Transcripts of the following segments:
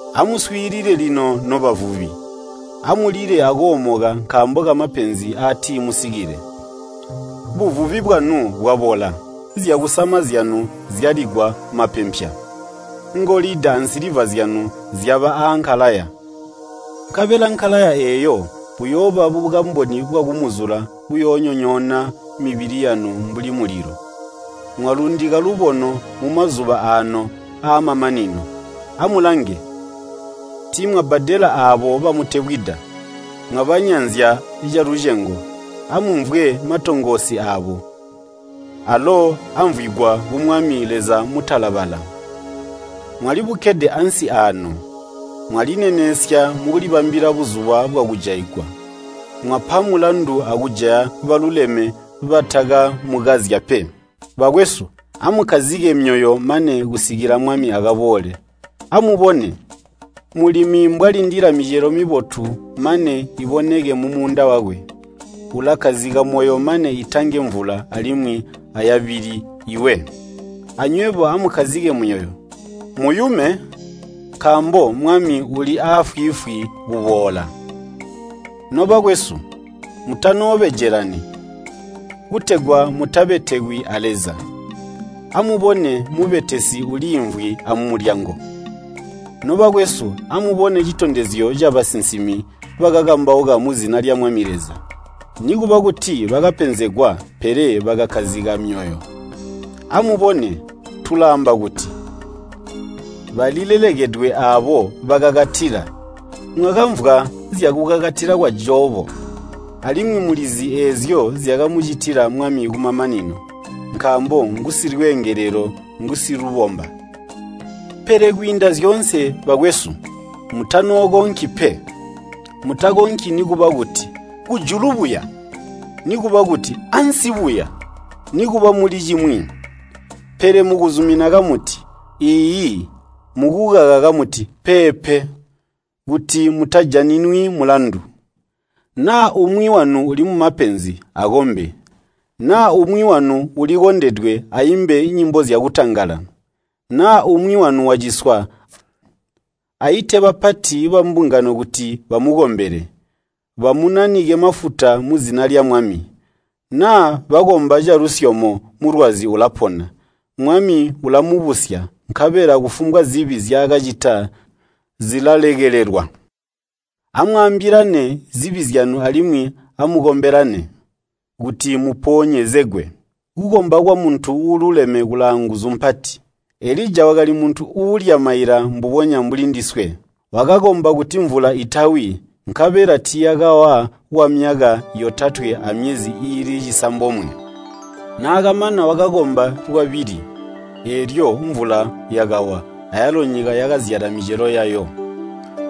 Amuswiilile lino nobavubi, amulile akoomoka nkaambo kamapenzi aatimusikile. Buvubi bwanu bwabola, zyakusama zyanu zyaligwa mapempya. Ngolida ansiliva zyanu zyaba aankalaya, nkabela nkalaya eeyo buyooba bukamboni bwakumuzula buyoonyonyoona mibili yanu mbuli mulilo. Mwalundika lubono mumazuba aano aamamanino. Amulange, tiimwabbadela aabo bamutebwida. Mwabanyanzya calucengo. Amumvwe matongoosi aabo, alo amvwigwa ku Mwami Leza Mutalabala. Mwalibukkede ansi aano. Mwalinenesya mukulibambilila buzuba bwakujaigwa. Mwapa mulandu akujaya baluleme batakamukazya pe. Bakwesu, amukkazike myoyo mane kusikila Mwami akaboole. Amubone, mulimi mbwalindila micelo mibotu mane iboneke mumuunda wakwe. Ulakkazika moyo mane itange mvula alimwi ayabili iwe. Anywebo amukkazike myoyo, muyume, nkaambo Mwami uli aafwiifwi kuboola. Nobakwesu, mutanoobejelani, kutegwa mutabetekwi a Leza. Amubone mubetesi uliimvwi aamulyango. Nobakwesu, amubone citondezyo cabasinsimi bakakambauka muzina lya Mwami Leza. Nikuba kuti bakapenzegwa pele bakakkazika myoyo. Amubone, tulaamba kuti, “Balilelekedwe aabo bakakatila.” Mwakamvwa zyakukakatila kwa Jobo, alimwi mulizi eezyo zyakamucitila Mwami kumamanino, nkaambo ngusilweengelelo ngusilubomba. Pele kwiinda zyoonse, bakwesu, mutanookonki pe. Mutakonki nikuba kuti, “Kujulu buya!” nikuba kuti, “Ansi buya!” nikuba muli cimwi. Pele mukuzumina kamuti, “Iiyi,” mukukaka kamuti, “Peepe,” kuti mutajaninwi mulandu. Naa umwi wanu uli mumapenzi, akombe. Naa umwi wanu ulikondedwe aimbe nyimbo zyakutangala. Naa umwi wanu waciswa, aite bapati bambungano kuti bamukombele, bamunanike mafuta muzina lya Mwami. Naa bakomba calusyomo mulwazi ulapona. Mwami ulamubusya, nkabela kufumbwa zibi nzyaakacita zilalekelelwa. Amwaambilane zibi zyanu alimwi amukombelane, kuti muponyezegwe. Kukomba kwamuntu uululeme kulaanguzu mpati. Elija wakali muntu uulya maila mbubonya mbuli ndiswe. Wakakomba kuti mvula itawi, nkabela tiiyakawa kwamyaka yotatwe amyezi iili cisambomwe. Naakamana wakakomba lwabili, eelyo mvula yakawa, ayalo nyika yakazyala micelo yayo.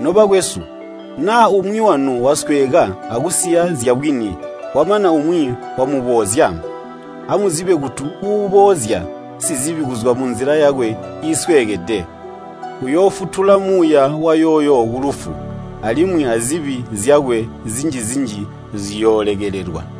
Nobakwesu, naa umwi wanu wasweeka akusiya zyabwini, kwamana umwi wamuboozya, amuzibe kuti uuboozya sizibi kuzwa munzila yakwe iisweekede, uyoofutula muuya wayooyo kulufu, alimwi azibi zyakwe zinji-zinji ziyoolekelelwa.